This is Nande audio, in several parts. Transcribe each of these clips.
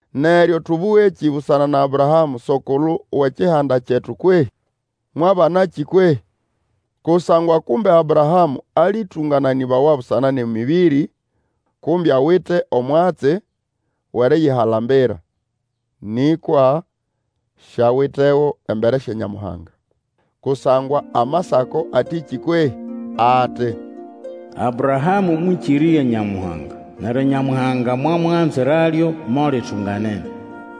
Neryo tũbũgekĩ busana na Abrahamũ, so-kulu wʼekihanda kyetu kwehĩ? Mwabanakĩ kwehĩ? Kusangwa kumbe Abrahamũ alĩtũngananĩbawa busana nʼemĩbĩrĩ, kumbe awite omwatsi wʼeriyihalambira; nĩkwa siawitego embere sya Nyamuhanga. Kusangwa Amasako atĩkĩ kwehĩ? Ati, Abrahamũ mwĩkĩrĩrya Nyamuhanga, neryo Nyamuhanga mwamuganziralyo mo litunganene.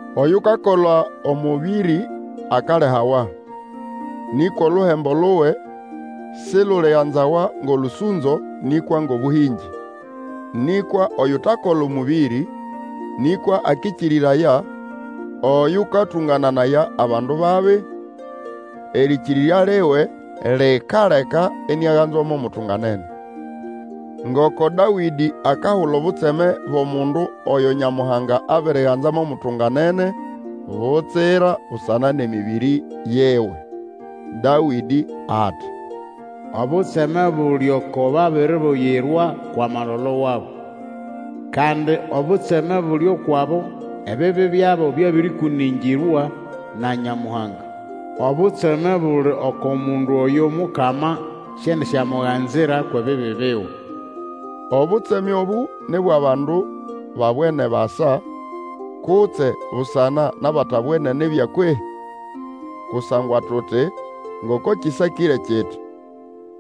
Oyukakola omũbĩrĩ akalihawa; nĩkwa oluhembo luwe siluliganzawa ngʼolũsũnzo, nĩkwa ngʼobũhĩngĩ. Nĩkwa oyutakola omũbĩrĩ, nĩkwa akĩkĩrĩraya oyũkatũngananaya abandu babi, erĩkĩrĩrya liwe likaleka iniaganzwa mo mutunganene. Ngoko Dawĩdĩ akahula obutseme bwʼomundu oyo Nyamuhanga abiriganza mo mutunganene butsira busana nʼemĩbĩrĩ yiwe. Dawĩdĩ ati, Obutseme buli oko babiribuyirwa kwʼamalolo wabo, Kandi obutseme buli ukwʼabo ebibi byabo byabĩrĩkũnĩngĩrwa na Nyamuhanga. Obutseme buli oko mundu oyo Omukama siendisyamuganzira kwʼebibi biwe. Obutseme obũ ni bwʼabandu babwene basa, kutse busana nʼabatabwene nibya kwehĩ? Kusangwa tuti, ngoko kĩsakĩre kiti,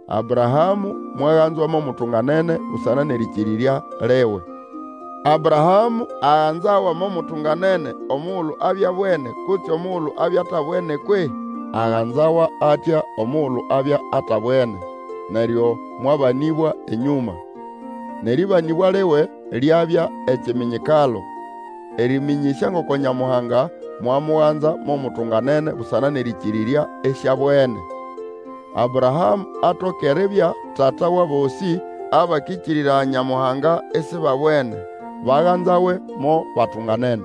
Abrahamũ mwaganzwa mo mutunganene busana nʼerĩkĩrĩrya liwe. Abrahamũ aganzawa mo mutunganene omugulu abya abwene kutse omugulu abya atabwene kwehĩ? Aganzawa atya omugulu abya atabwene, neryo mwabanĩbwa enyũma. Nʼeribambwa liwe lyabya ekiminyikalo, erĩmĩnyĩsya ngoko Nyamuhanga mwamuganza mo mutunganene busana nʼerĩkĩrĩrya, isiabwene. Abrahamũ atoke eribya tata wʼabosĩ abakĩkĩrĩraya Nyamuhanga isibabwene, baganzawe mo batunganene.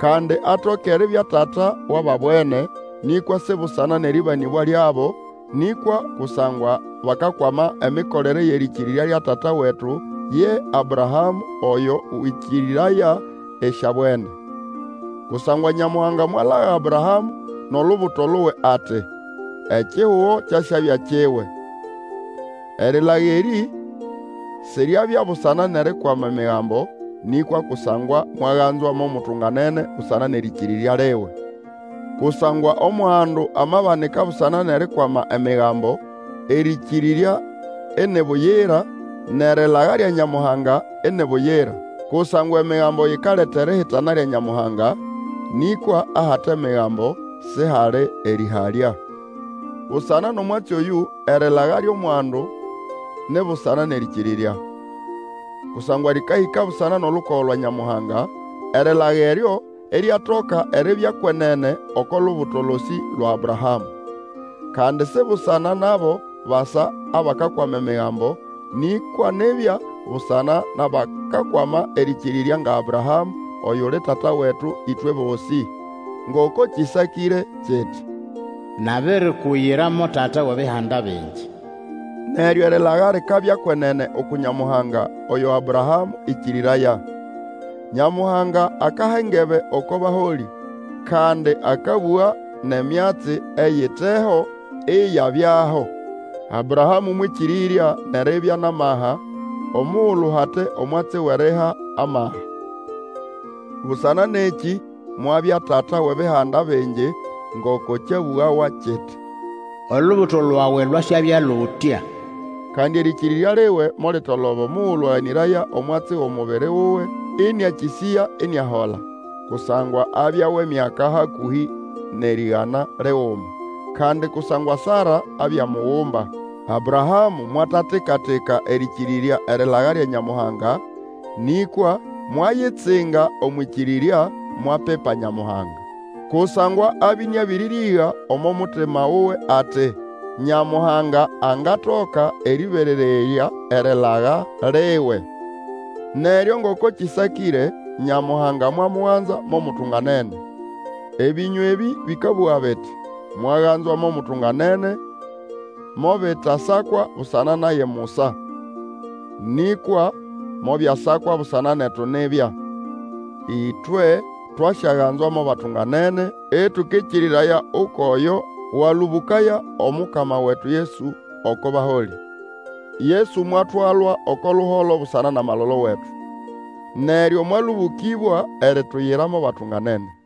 Kandi atoke eribya tata wʼababwene, nĩkwa si busana nʼerĩbambwa lyabo, nĩkwa kusangwa bakakwama emikolere yʼerĩkĩrĩrya lya tata wetu ye Abrahamũ, oyo wĩkĩrĩraya isiabwene. Kusangwa Nyamuhanga mwalaga Abrahamũ nʼolubuto luwe ati, Ekihugo kyasyabya kiwe. Erilaga erĩ siryabya busana nʼerikwama Emigambo, nĩkwa kusangwa mwaganzwa mo mutunganene busana nʼerĩkĩrĩrya liwe. Kusangwa omwandu amabanika busana nʼerikwama Emigambo, erĩkĩrĩrya ini buyira nʼerilaga lya Nyamuhanga ini buyira. Kusangwa Emigambo yikaleta erihitana lya Nyamuhanga, nĩkwa ahate Migambo sihali erĩhalya. Busana nʼomwatsi oyũ, Erĩlaga lyʼomwandu ni busana nʼerĩkĩrĩrya. Kusangwa lĩkahĩka busana nʼolukogo lwa Nyamuhanga, erilaga eryo iryatoka eribya kwenene oko lubuto losĩ lwa Abrahamũ. Kandi si busana nʼabo basa abakakwama Emigambo, nĩkwa nibya busana nʼabakakwama erĩkĩrĩrya nga Abrahamũ, oyuli tata wetu ĩtwe bosĩ. Ngoko kĩsakĩre kiti, Nabirikuyira mo tata wʼebihanda bingi. Neryo erilaga likabya kwenene uku Nyamuhanga, oyo Abrahamũ ĩkĩrĩraya. Nyamuhanga akaha engebe oko baholĩ, kandi akabũga nʼemyatsi eyiteho iyabyaho. Abrahamũ mwĩkĩrĩrya nʼeribya nʼamaha omugulu hate omwatsi wʼeriha amaha. Busana nʼekĩ mwabya tata wʼebihanda bingi, ngoko kyabũgawa kiti, Olubuto lwawe lwasyabya lutya. Kandi erĩkĩrĩrya liwe molitoloba omugulu aganĩraya omwatsi wʼomubiri wuwe ĩnĩakĩsĩya iniahola, kusangwa abya wʼemyaka hakũhĩ nʼerĩgana liguma. Kandi kusangwa Sara abya mugumba. Abrahamũ mwatatika-tika erĩkĩrĩrya erilaga lya Nyamuhanga, nĩkwa mwayitsinga omwʼĩkĩrĩrya, mwapipa Nyamuhanga. Kusangwa abya ĩnĩabĩrĩrĩga omo mutima wuwe ati, Nyamuhanga angatoka erĩberererya erilaga liwe. Neryo ngoko kĩsakĩre, Nyamuhanga mwamuganza mo mutunganene. Ebĩnywa ebĩ bĩkabũga biti, Mwaganzwa mo mutunganene, mobitasakwa busana naye musa. Nĩkwa mobyasakwa busana netu nibya. Ĩtwe twasyaganzwa mo batunganene ĩtũkĩkĩrĩraya ukwʼoyo walũbũkaya Omukama wetu Yesu oko baholĩ. Yesu mwatwalwa oko luholo busana nʼamalolo wetu, neryo mwalũbũkĩbwa erituyira mo batunganene.